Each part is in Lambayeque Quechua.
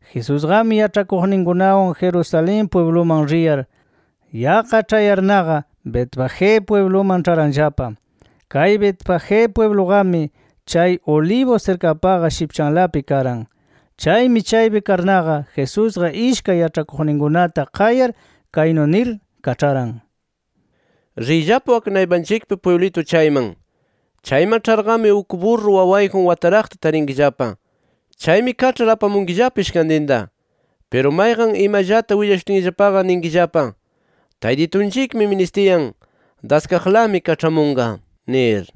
Jesusqami yaĉhakuqninkunawan Jerusalén pwibluman riyar, yaqqa ĉhayarnaqa, Betfagé pwibluman ĉharanllapa. Kay Betfagé pwibluqami chay Olivos sirkapaqa shipchanlapi karan. Chaymi chaypi karnaqa Jesusqa ishkay yaĉhakuqninkunata qayar, kaynu nir kaĉharan: “Riyllapa wak naypanchikpi pwiblitu chayman. Chayman ĉharqami uk burra wawayjun wataraqta tarinkillapa. Chaymi kaĉhar apamunkillapa ishkantinta. Piru mayqan imallata willashutinllapaqa ninkillapa: ‘Taytitunchikmi ministiyan, daskaqlami kaĉhamunqa’ nir”.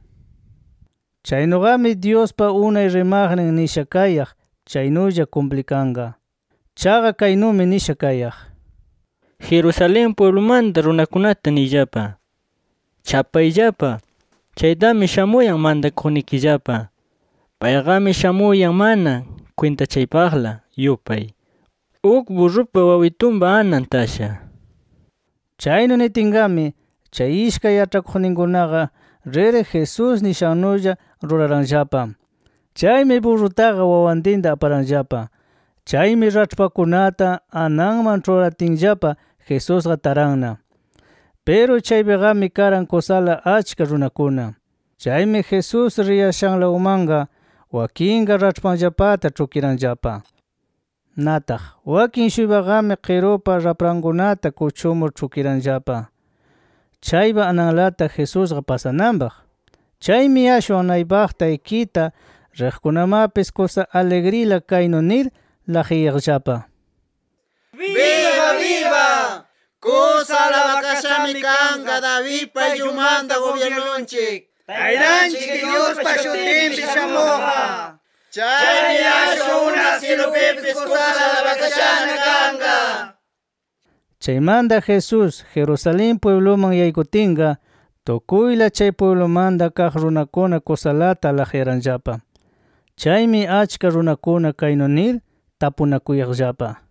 Chaynuqami Dyuspa unay rimaqnin nisha kayaq chaynulla kumplikanqa. Chaqa kaynumi nisha kayaq: “Jerusalén pwiblumanta runakunata niyllapa: ‘Chapayllapa, chaytami shamuyan mantakuqnikillapa. Payqami shamuyan mana kwintachaypaqla yupay, uk burrupa wawitunpa anan tasha’ nir”. Chaynu nitinqami, chay ishkay yaĉhakuqninkunaqa rir Jesús nishannulla ruraranllapa. Chaymi burrataqa wawantinta aparanllapa. Chaymi raĉhpakunata ananman ĉhuratinllapa Jesusqa taranna. Piru chaypiqami karan kusala achka runakuna. Chaymi Jesús riyashanlawmanqa wakinqa raĉhpanllapata ĉhukiranllapa. Nataq wakin-shuypaqami qirupa raprankunata kuchumur ĉhukiranllapa, chaypa ananlata Jesusqa pasananpaq. Chaymi ashwan naypaqta ikita riqkunamapis kusa aligrila kaynu nir laqyayaqllapa: “¡Biba biba! ¡Kusa alabakashami kanqa Davidpa ayllunmanta gubyirnunchik, Taytanchik Dyuspa shutinpi shamuqqa! Chaymi ashwan unaq syilupipis kusa alabakashana kanqa” nir. Chaymanta Jesús, Jerusalén pwibluman yaykutinqa, tukuyla chay pwiblumanta kaq runakuna kusalata laqyaranllapa. Chaymi achka runakuna kaynu nir tapunakuyaqllapa: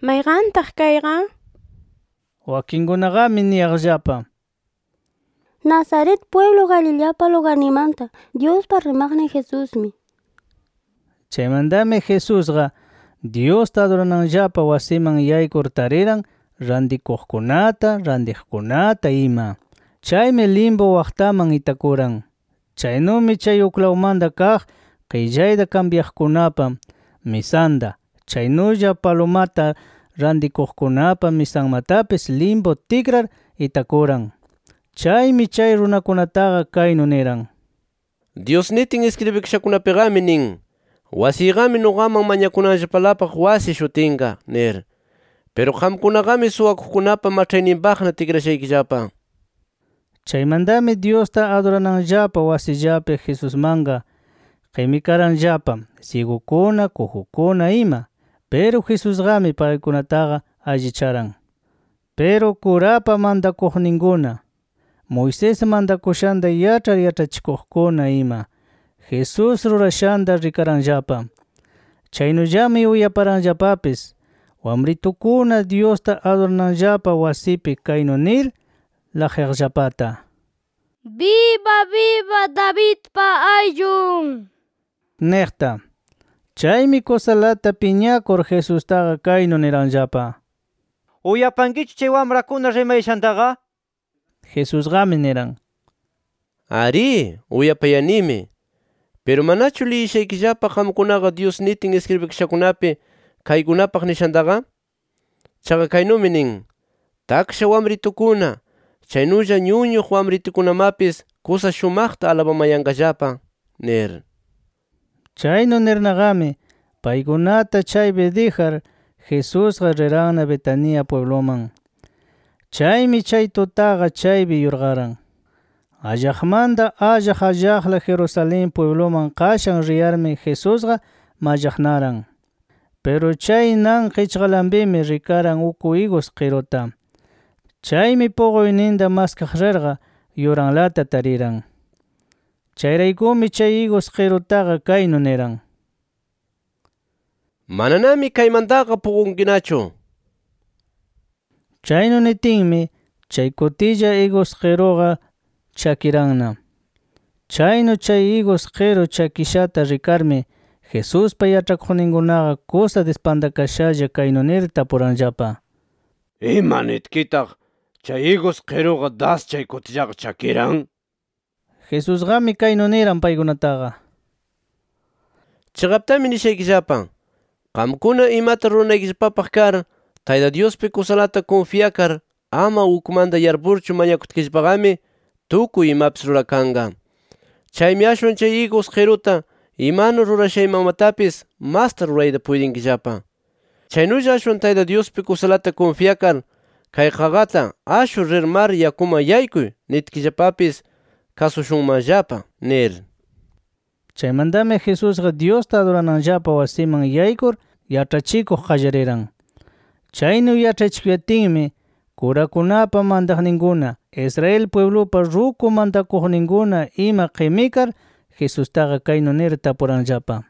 —¿Mayqantaq kayqa? nir. Wakinkunaqami niyaqllapa: —Nazaret pwiblu Galileapa lugarninmanta Dyuspaq rimaqnin Jesusmi nir. Chaymantami Jesusqa, Dyusta adurananllapa wasiman yaykur tariran rantikuqkunata, rantiqkunata ima. Chaymi limpu waqtaman itakuran. Chaynumi chay uklawmanta kaq qillayta kambyaqkunapa misanta, chaynulla palumata rantikuqkunapa misanmatapis limpu tikrar itakuran. Chaymi chay runakunataqa kaynu niran: “Dyus nitin iskribikashakunapiqami nin: ‘Wasiyqami nuqaman mañakunanllapalapaq wasi shutinqa’ nir. Piru qamkunaqami suwakuqkunapa maĉhayninpaqna tikrashaykillapa” nir. Chaymantami Dyusta adurananllapa wasillapi Jesusmanqa qimikaranllapa syigukuna, kujukuna ima. Piru Jesusqami paykunataqa allicharan. Piru kurapa mantakuqninkuna, Moisés mantakushanta yaĉhar yaĉhachikuqkuna ima Jesús rurashanta rikaranllapa. Chaynullami uyaparanllapapis wamritukuna Dyusta adurananllapa wasipi kaynu nir laqyaqllapata “¡Biba biba Davidpa ayllun!” niqta. Chaymi kusalata piñakur, Jesustaqa kaynu niranllapa: —¿Uyapankichu chay wamrakuna rimayashantaqa? nir. Jesusqami niran: —Arí, uyapayanimi. Piru ¿manachu liyishaykillapa qamkunaqa Dyus nitin iskribikashakunapi kaykunapaq nishantaqa? Chaqa kaynumi nin: ‘Taksha wamritukuna, chaynulla ñuñuq wamritukunamapis kusa shumaqta alabamayanqallapa’ nir. Chaynu nirnaqami paykunata chaypi dijar, Jesusqa riranna Betania pwibluman. Chaymi chay tutaqa chaypi yurqaran. Allaqmanta allaq allaqla Jerusalén pwibluman qashan riyarmi Jesusqa mallaqnaran. Piru chay nan qichqalanpimi rikaran uk igus qiruta. Chaymi puquyninta maskaq rirqa yuranlata tariran. Chayraykumi, chay igus qirutaqa kaynu niran: “¡Mananami kaymantaqa puqunkinachu!” nir. Chaynu nitinmi chay kutilla, igus qiruqa chakiranna. Chaynu chay igus qiru chakishata rikarmi, Jesuspa yaĉhakuqninkunaqa kusa dispantakashalla kaynu nir tapuranllapa: —¿Ima nitkitaq chay igus qiruqa das chay kutillaqa chakiran? nir. Jesusqami kaynu niran paykunataqa: —Chiqaptami nishaykillapa: Qamkuna imata ruranaykillapapaq kar Tayta Dyuspi kusalata kunfyakar ama ukmanta yarpurchu mañakutkillapaqami, tukuy imapis rurakanqa. Chaymi ashwan chay igus qiruta imanu rurashaymanmatapis masta rurayta puytinkillapa. Chaynulla ashwan Tayta Dyuspi kusalata kunfyakar, kay qaqata ‘Ashur, rir mar yakuman yaykuy’ nitkillapapis kasushunmanllapa nir. Chaymantami Jesusqa Dyusta adurananllapa wasiman yaykur yaĉhachikuq qallariran. Chaynu yaĉhachikuyatinmi, kurakunapa mantaqninkuna, Israel pwiblupa ruku mantakuqninkuna ima qimikar, Jesustaqa kaynu nir tapuranllapa: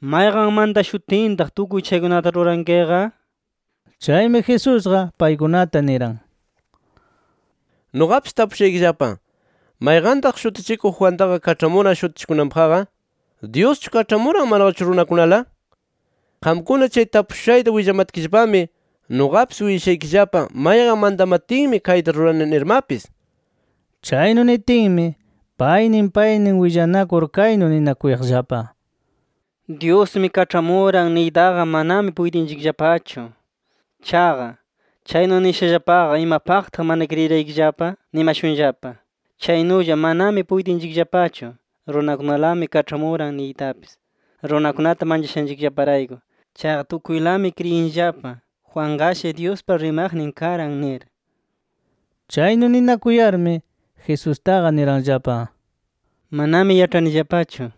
—¿Mayqan mantashutintaq tukuy chaykunata rurankiqa? nir. Chaymi, Jesusqa paykunata niran: —Nuqapis tapushaykillapa: ¿Mayqantaq Shutichikuq Juantaqa kaĉhamuran shutichikunanpaqqa? ¿Dyuschu kaĉhamuran manaqachu runakunala? Qamkuna chay tapushushayta willamatkillapami, nuqapis willashaykillapa mayqan mantamatinmi kayta rurani nirmapis. Chaynu nitinmi, paynin paynin willanakur kaynu ninakuyaqllapa: “ ‘Dyusmi kaĉhamuran’ niytaqa manami puytinchikllapachu. Chaqa, chaynu nishallapaqa ‘¿Imapaqtaq mana kriyiraykillapa?’ nimashunllapa. Chaynulla, manami puytinchikllapachu ‘Runakunalami kaĉhamuran’ niytapis, runakunata manchashanchikllaparayku. Chaqa tukuylami kriyinllapa ‘Juanqashi Dyuspa rimaqnin karan’ nir”. Chaynu ninakuyarmi, Jesustaqa niranllapa: —Manami yaĉhanillapachu nir.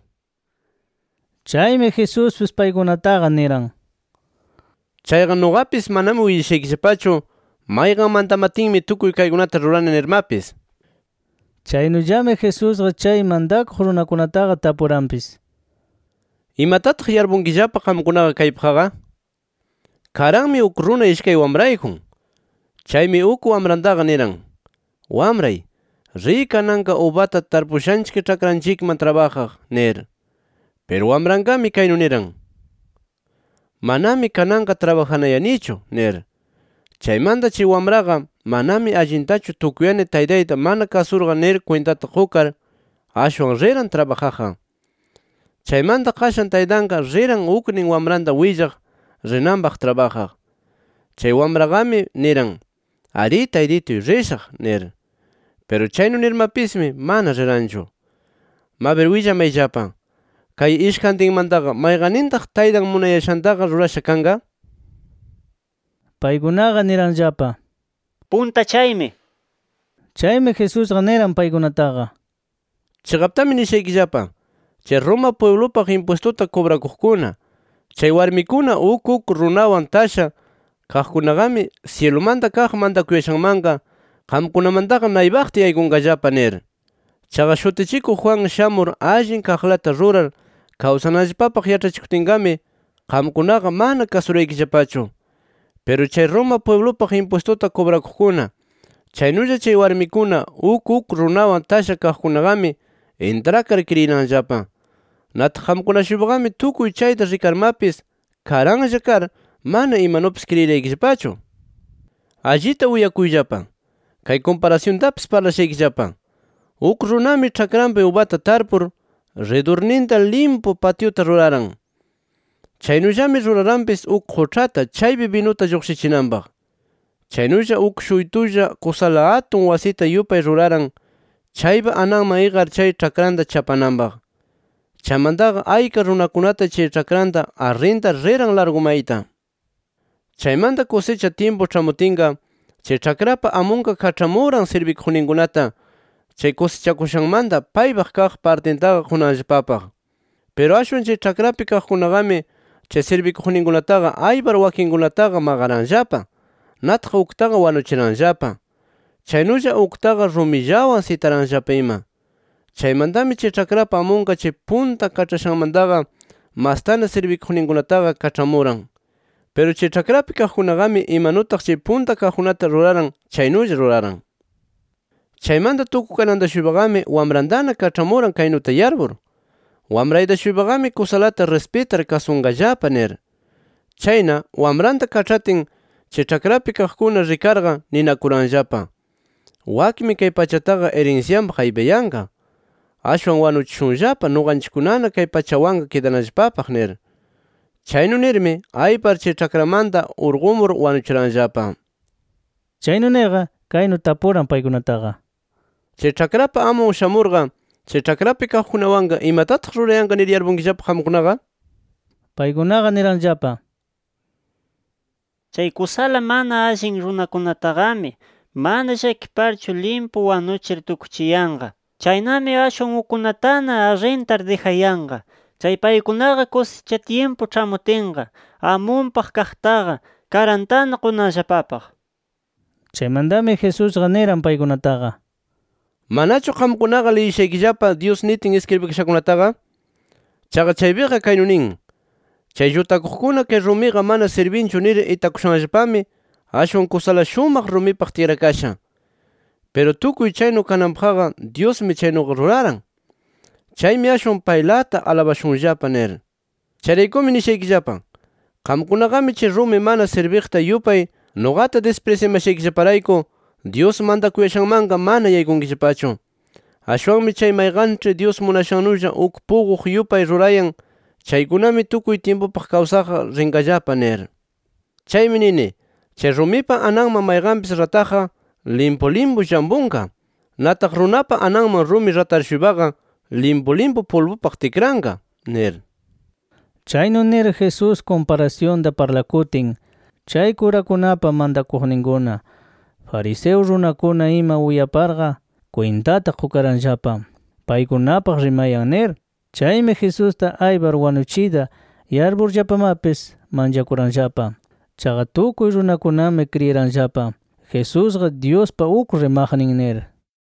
Chaymi, Jesuspis paykunataqa niran: —Chayqa nuqapis manami willashaykillapachu, mayqan mantamatinmi tukuy kaykunata rurani nirmapis. Chaynullami Jesusqa chay mantakuq runakunataqa tapuranpis: —¿Imatataq yarpunkillapa qamkunaqa kaypaqqa? Karanmi uk runa ishkay wamrayjun. Chaymi uk wamrantaqa niran: ‘Wamray, riy kananqa ubata tarpushanchik ĉhakranchikman trabajaq’ nir. Piru wamranqami kaynu niran: ‘¡Manami kananqa trabajanayanichu!’ nir. Chaymanta, chay wamraqa manami allintachu tukuyani taytayta mana kasurqa nir kwintata qukar, ashwan riran trabajaqqa. Chaymanta qashan taytanqa riran uknin wamranta willaq rinanpaq trabajaq. Chay wamraqami niran: ‘Arí, taytituy rishaq’ nir. Piru chaynu nirmapismi mana riranchu. Mabir willamayllapa: ¿Kay ishkantinmantaqa mayqannintaq taytan munayashantaqa rurasha kanqa? Paykunaqa niranllapa: —Punta chaymi nir. Chaymi Jesusqa niran paykunataqa: —Chiqaptami nishaykillapa: Chay Roma pwiblupaq impwistuta kubrakuqkuna, chay warmikuna uk uk runawan tasha kaqkunaqami, syilumanta kaq mantakuyashanmanqa qamkunamantaqa naypaqta yaykunqallapa nir. Chaqa Shutichikuq Juan shamur allin kaqlata rurar kawsananllapapaq yaĉhachikutinqami, qamkunaqa mana kasuraykillapachu. Piru chay Roma pwiblupaq impwistuta kubrakuqkuna, chaynulla chay warmikuna uk uk runawan tasha kaqkunaqami, intrakar kriyiranllapa. Nataq qamkuna-shuypaqami tukuy chayta rikarmapis karanlla kar, mana imanupis kriyiraykillapachu. “¡Allita uyakuyllapa! Kay kumparasyuntapis parlashaykillapa: Uk runami ĉhakranpi ubata tarpur, ridurninta limpu patyuta ruraran. Chaynullami ruraranpis uk quĉhata chaypi binuta lluqshichinanpaq. Chaynulla uk shuytulla kusala atun wasita yupay ruraran, chaypa ananman iqar chay ĉhakranta chapananpaq. Chaymantaqa ayka runakunata chay ĉhakranta arrintar riran largu mayta. “Chaymanta kusicha tyimpu ĉhamutinqa, chay ĉhakrapa amunqa kaĉhamuran sirbikuqninkunata, chay kusichakushanmanta paypaq kaq partintaqa qunanllapapaq. Piru ashwan chay ĉhakrapi kaqkunaqami, chay sirbikuqninkunataqa aypar wakinkunataqa maqaranllapa. Nataq uktaqa wanuchiranllapa. Chaynulla uktaqa rumillawan sitaranllapa ima. Chaymantami chay ĉhakrapa amunqa chay punta kaĉhashanmantaqa mastana sirbikuqninkunataqa kaĉhamuran. Piru chay ĉhakrapi kaqkunaqami imanutaq chay punta kaqkunata ruraran chaynulla ruraran. “Chaymanta tukukananta-shuypaqami wamrantana kaĉhamuran, kaynuta yarpur: ‘Wamrayta-shuypaqami kusalata rispitar kasunqallapa’ nir. Chayna wamranta kaĉhatin, chay ĉhakrapi kaqkuna rikarqa, ninakuranllapa: ‘Wakmi kay pachataqa irinsyanpaq aypayanqa. ¡Ashwan wanuchishunllapa nuqanchikkunana kay pachanwanqa kidanallapapaq!’ nir. Chaynu nirmi aypar chay ĉhakramanta urqumur wanuchiranllapa”. Chaynu nirqa kaynu tapuran paykunataqa: —¿Chay ĉhakrapa amun shamurqa, chay ĉhakrapi kaqkunawanqa imatataq rurayanqa nir yarpunkillapa qamkunaqa? Paykunaqa niranllapa: —Chay kusala mana allin runakunataqami mana llakiparchu limpu wanuchir tukchiyanqa. Chaynami ashwan ukkunatana arrintar dijayanqa, chay paykunaqa kusicha tyimpu ĉhamutinqa amunpaq kaqtaqa karantana qunanllapapaq nir. Chaymantami Jesusqa niran paykunataqa: —¿Manachu qamkunaqa liyishaykillapa, Dyus nitin iskribikashakunataqa? Chaqa chaypiqa kaynu nin: ‘Chay llutakuqkuna kay rumiqa mana sirbinchu nir itakushanllapami, ashwan kusala shumaq rumipaq tikrakasha. Piru tukuy chaynu kananpaqqa Dyusmi chaynuqa ruraran. Chaymi ashwan paylata alabashunllapa’ nir. Chayraykumi nishaykillapa: Qamkunaqami chay rumi mana sirbiqta yupay nuqata disprisyamashaykillaparayku Dyus mantakuyashanmanqa mana yaykunkillapachu. Ashwanmi chay mayqanĉhi Dyus munashannulla uk puquq yupay rurayan chaykunami tukuy tyimpupaq kawsaqqa rinqallapa nir. Chaymi nini, chay rumipa ananman mayqanpis rataqqa, limpu limpu llampunqa. Nataq, runapa ananman rumi ratar-shuypaqa, limpu limpu pulbupaq tikranqa nir. Chaynu nir Jesús kumparasyunta parlakutin, chay kurakunapa mantakuqninkuna, fariseo runakuna ima uyaparqa, kwintata qukaranllapa paykunapaq rimayan nir. Chaymi Jesusta aypar wanuchiyta yarpurllapamapis, manchakuranllapa. Chaqa tukuy runakunami kriyiranllapa Jesusqa, Dyuspa uk rimaqnin nir.